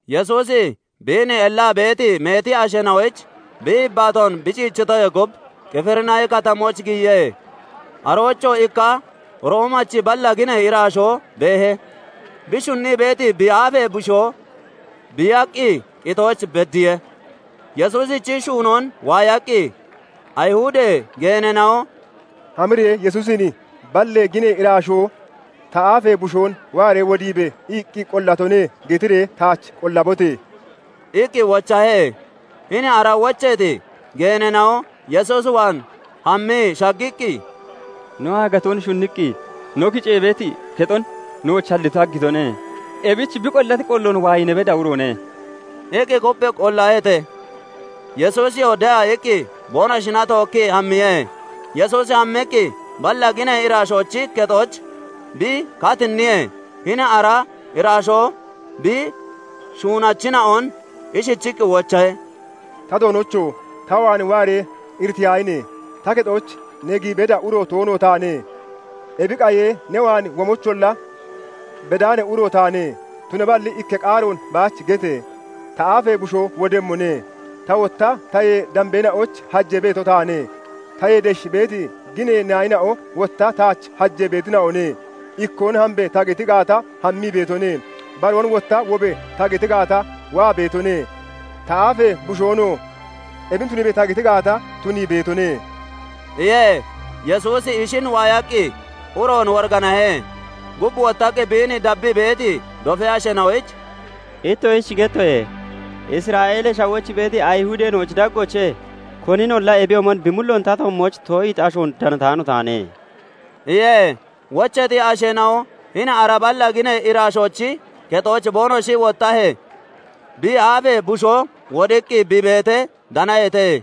Yesuusi biin ellaa beeti meeti asheena'oyich bi yibbaatoon bi ciichitoyee gub, Qifirinaahi Katamooch giyiye. Aroochoo ikka Roomachi balla ginee iraashoo beehe; bi shunnii beeti bi aafee bushoo biiyaqqi qitooch beddiye. Yesuusichi shuunoon waayaqqi Ayihudee geeneena'on "Hamiree Yesuusin 'Balla ginee iraashoo "Ta aafee bushoon waaree wodiibe!" iqqi qollatone' getiree taach qollabote!" iqqi wochahe. Hini ara wocheeti geeneena'oo Yesuus waan hammii shaggiqqi, "No aagatoon shunniqqi no kicee beeti kexon nooch haggiitone; ebichi bi qollati qolloon waayi ne bedda uroone" iqqi kupphii qollaheete. Yesuusiyoo de'a iqqi boonoshina tookkii hammiye. Yesuusi hammiqqi balla ginee iraashoochi kexooch bi katinniyee, hini ara iraashoo bi shuunachina'on ishichiqqi wochahe; "Ta Doonocho! Ta waan waaree iriteyaahine! Ta kexooch ne giyi bedda uro toono taane; Ebi qayee ne waan womoyicholla bedaani uro taane; tunaballi ikka qaaroon baach gete! Ta aafee bushoo wodemmone. Ta wotta tayee dambeena'oyich hajee beeto taane; tayee desh beeti ginee naayina'o wotta taach hajee beetina'one; ikkoon 'Hambe!' ta geti gaata, hammii beetone; baroon wotta 'Wobe!' ta geti gaata, waa beetone; ta aafee bushoonoo 'Ebin tuniibe!' ta geti gaata, tunii beetone" iye. Yesuusi ishin waayaqqi uroon woriganahe; gub wottaqqi biin dabbii beeti dofee asheena'oyich "Ittoshich gettoye; Isra'eelee Shawooch beeti Ayihudeena'ochi daggoochee koninolla ebiyoomon bi mulloon ta toommooch too'iiti ashoon danataano taane" iye. Wocheeti asheena'o hini ara balla ginee iraashoochi kexooch boonoshi wottahee, bi aafee bushoo wodiqqi bi beetee danaheete.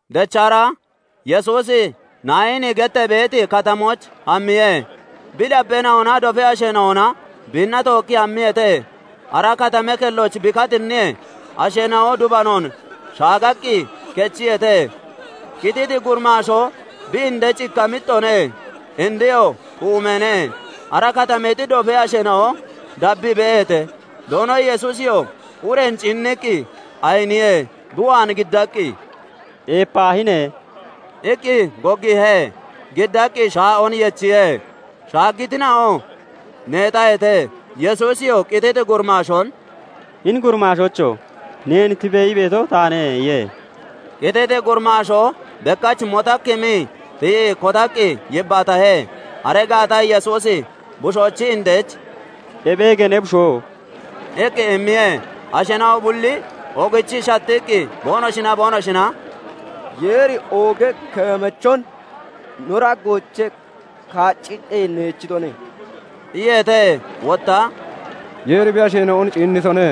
Dechra Yesuusi Naayini gettee beeti katamooch hammiye; bi dabbeena'onaa dofee asheena'ona biinna tookkii hammiyeete. Ara katamee kelloch bi katinniyee, asheena'o dubanoon shaaggaqqi kechiyeete; qititi gurimaashoo bi indech ikka mixxoone; indeyoo xuumeene. Ara katameexi dofee asheena'o dabbii beeheete. Doono Yesuusiyoo ureen ciinniqqi ayiniye; bi waan giddaqqi "Eepaahine!" iqqi goggiihe. Giddaqqi shaa'oon yechiye. Shaaggitina'oo neexaheete. Yesuusiyoo qititi gurimaashoon "Hini gurimaashoocho! Neen 'Tibe!' ii beeto taane' iye. Qititi gurimaashoo bekkach motakkimii tiyii kotaqqi yibbaatahe. Aree gaata Yesuusi bushoochi indech "Ebeege ne bushoo!" iqqi immiye. Asheena'o bulli oogichii shattiqqi boonoshinaa boonoshina "Yeeri ooga keemachon no daggoochee kaacciqqi neechitone" iyeete. Wotta "Yeeri bi asheena'on ciinnitone"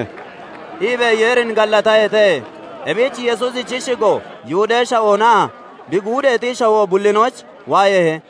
iibee Yeerin gallataheete. Ebich Yesuusichi shigo Yihudee Shawoonaa bi guudeexi shawoo bullinooch waayeehe.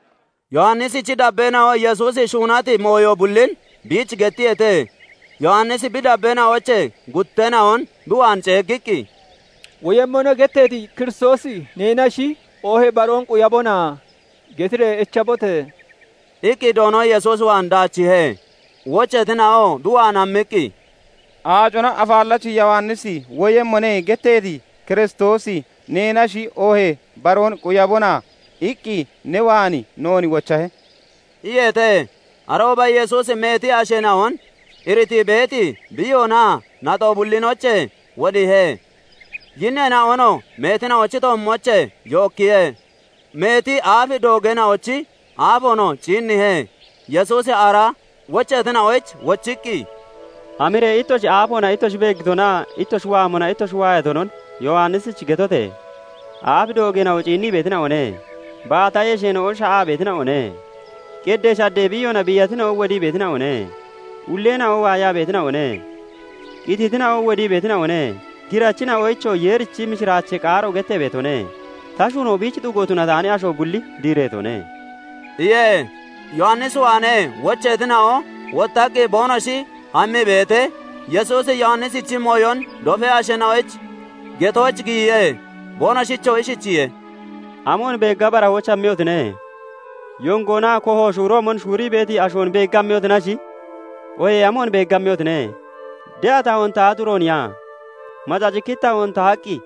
Yowannisichi dabbeena'o Yesuusi shuunati mooyo bullin biich gettiyeete. Yowannisi bi dabbeena'oochee gutteena'on bi waan ceeggiqqi, " ' "Woyemmone" getteeti Kiristoosi neenashi, oohee baroon quyabona?' getiree echbote!" iqqi Doono Yesuus waan daachiihe. Wocheetina'oo bi waan hammiqqi, "Aacona Afaallachi Yowannisi ' "Woyemmone" getteeti Kiristoosi neenashi, oohee baroon quyabona?' iqqi ne waan noon wochahe" iyeete. Arooba Yesuusi meeti asheena'on iritii beeti biiyoonaa naxo bullinoochee wodiihe; yinneena'onoo meetina'ochi toommoochee yookkiye; meeti aaf doogeena'ochi aafoonoo ciinniihe. Yesuusi ara wocheetina'oyich wochiqqi, "Hamiree ittoshi aafoona ittoshi beeggitonaa ittoshi waamona ittoshi waayatonon Yowannisich getote! Aaf doogeena'o ciinnii beetina'one; baata yesheena'o sha'aa beetina'one; qeddee shaddee biiyoona biiyatina'o wodii beetina'one; ulleena'o waayaa beetina'one; qititina'o wodii beetina'one; girachina'oyichoo Yeerichi mishiraachee qaaro gettee beetone; Ta shuunoo biich xugo tunataani asho bulli diireetone" iye. Yowannis waanee wocheetina'o wottaqqi boonoshi hammii beetee, Yesuusi Yowannisichi mooyon dofee asheena'oyich getooch giyiye; boonoshichoo ishichiye:- "Amoon beegga barahooch hammiyotine? Yongoona koho shuuroomon shuurii beeti ashoon beegga hammiyotinash, oohee amoon beegga hammiyotine? De'a tahoon tahati urooniya? Macacikkiti tahoon tahaqqi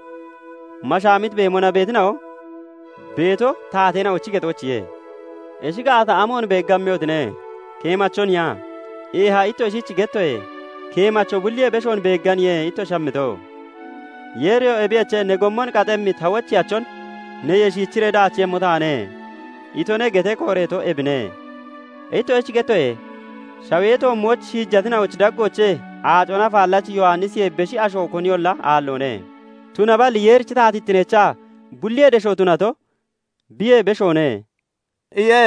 mashaamiti beemona beetina'o beeto taateena'ochi kexoochiye. Ishi gaata amoon beegga hammiyotine? Keemachoniya? Eeha, ittoshich gettoye; keemacho bulliyee beshoon beegganiye ittoshi hamito. " 'Yeeriyoo "Ebiyoche, ne gommon qaxxemmi ta wocheyachon neyee shiichiree daachiiyemmo taane" itone' getee kooreeto ebine. Ittoshich gettoye; shawee toommooch shiijatina'ochi daggoochee Aacona Afaallachi Yowannisiyee beshi asho koniyolla aalloone; tunaballi Yeerichi taatittineecha bulliyee desho tunato biyee beshoone" iye.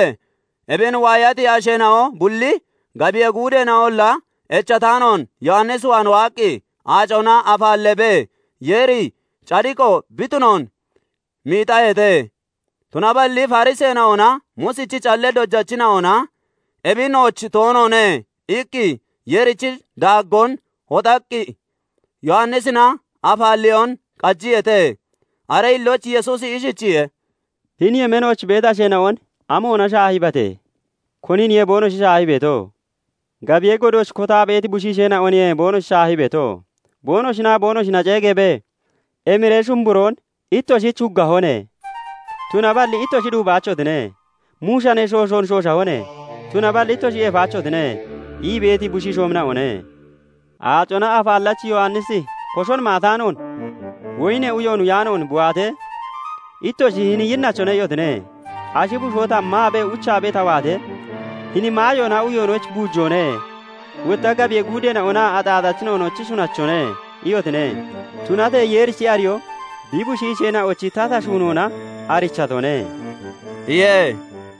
Ebin waayati asheena'o bulli, gabiyee guudeena'olla echataanoon Yowannis waan waaqqi aacona afaalleebee Yeeri cadiqo bi tunoon miixaheete. Tunaballi Fariseena'onaa Muusichi callee dojachina'ona "Ebi nooch toonoone" iqqi Yeerichi daaggoon hoxaqqi Yowannisina afaalleyoon qajiyeete. Aree hillooch Yesuusi ishichiye:- "Hini yemeenooch beeti asheena'on amoona shaahiibate? Koniniye boonoshi shaahii beeto? Gabiyee godooch kotaa beeti bushiisheena'oniye boonoshi shaahii beeto; boonoshinaa boonoshina ceegeebee, 'Emiree shumburoon ittoshich huggahone; tunaballi ittoshi duubaachotine; muushanee shooshoon shooshahone; tunaballi ittoshi eefaachotine' ii beeti bushiishoomina'one. Aacona Afaallachi Yowannisi koshon maataanoon, woyinee uyoon uyaanoon bi waatee, ittoshi 'Hini yinnachone' iyotine. Ashi bushoo ta maabee, uchaabee ta waatee, 'Hini maayoonaa uyoonochi buujoone; wotta gabiyee guudeena'onaa axaaxachina'onochi shunachone' iyotine. Tunatee Yeerichi ariyoo bi bushiisheena'ochi tata shuunoona arichatone" iye.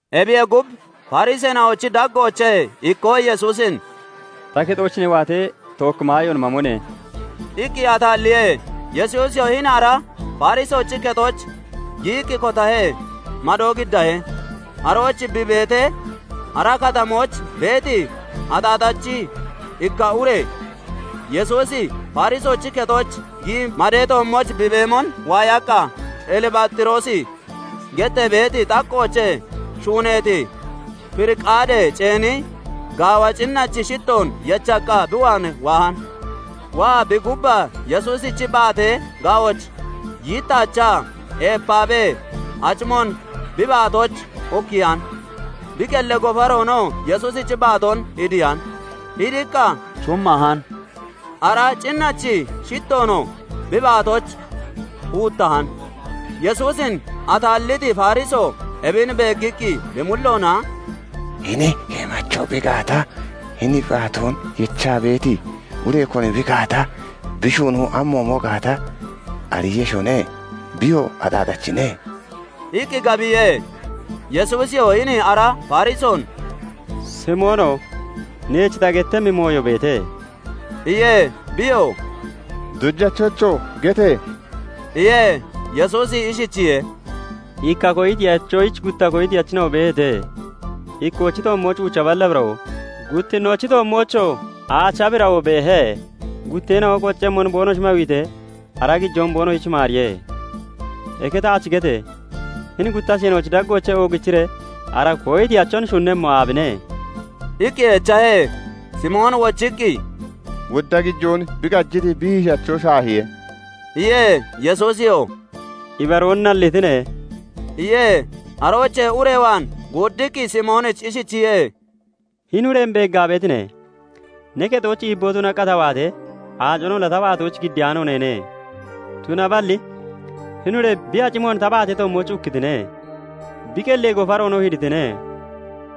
Ebiyee gub, Fariseena'ochi daggoochee ikkoo Yesuusin "Ta kexooch ne waatee, tookki maayoon mamone!" iqqi ataalliye. Yesuusiyoo hini ara Farisoochi kexooch giyiqqi kotahe; madoo giddahe. Arooch bi beetee, ara katamooch beeti axaaxachi ikka ure Yesuusi Farisoochi kexooch giyii madee toommooch bi beemon waayaqqa, Elibaaxiroosi gettee beeti xaqqoochee shuuneeti firiqaadee ceeni gaawa cinnachi shittoon yechaqqa bi waan waahan. Waa bi gubbaa Yesuusichi baatee ga'ooch yittaachaa eepaabee acimoon bi baatooch ukkiyan; bi qellee gofaroonoo Yesuusichi baatoon hidiyan; hidiqqa shummahan; ara cinnachi shittoonoo bi baatooch huuttahan. Yesuusin ataalliti Farisoo ebin beeggiqqi, bi mulloona "Hini keemacho bi gaata, hini bi baatoon yechaa beeti ure koni bi gaata, bi shuunoo amoomo gaata ariiyeshone; biyoo axaaxachine" iqqi gabiye. Yesuusiyoo hini ara Farisoon "Simoono! Neech ta gettemmi mooyo beete" iye. Biyoo "Dojachocho! gete!" iye. Yesuusi ishichiye:- "Ikka koyitiyachoyich gutta koyitachina'o beeheete. Ikkoochi toommooch uucha balla birawoo, guttinnoochi toommoochoo aacha birawoo beehe. Gutteena'olla qoccemmon boonoshi mawiitee, ara gijoon boonoshich maariye. Eke taach gete! Hini gutta asheena'ochi daggoochee oogichiree ara koyitiyachon shunemmo aabine?" iqqi echahe. Simooni wochiqqi, "Wodda gijoon bi qajiti hiishaacho shaahiye" iye. Yesuusiyoo "Ibaroon nallitine" iye. Aroochee ure waan guuddiqqi Simoonichi ishichiye:- "Hini ureen beeggaa beetine? Ne kexooch iibboo tunaqqa ta waatee, aaconolla ta baatoyich giddiyaano neene; tunaballi hini ure bi acimoon ta baatee toommooch ukkitine; bi qellee gofaroonoo hiditine.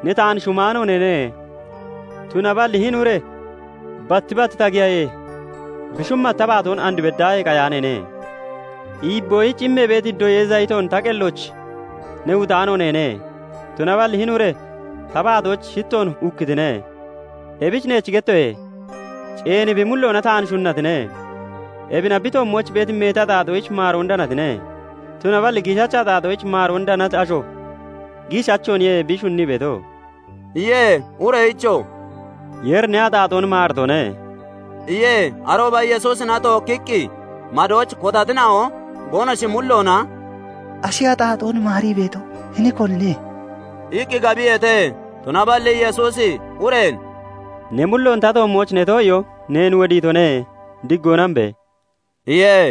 Ne taan shumaano neene; tunaballi hini ure batti bat ta giyahee, bi shummati ta baatoon and beddaahee qayaaneene. Iibboyich immee beeti doyee zayitoon ta qellooch ne huutaano neene; tunaballi hini ure ta baatooch shittoon ukkitine. Ebich neech gettoye; ceeni bi mulloona taan shunnatine; ebina bi toommooch beeti meeti axaaxoyich maaroon danatine; tunaballi giishacha axaaxoyich maaroon danati asho giishachooniye bi shunnii beeto" iye. Ureyichoo "Yeeri ne axaaxoon maaritone" iye. Arooba Yesuusina tookkiqqi madooch kotatina'o boonoshi mulloona "Ashi axaaxoonolla maarii beeto, hini konine?" iqqi gabiyeete. Tunaballi Yesuusi ureen "Ne mulloon ta toommooch ne too'iyoo neen wodiitone. Diggoona hambe!" iye.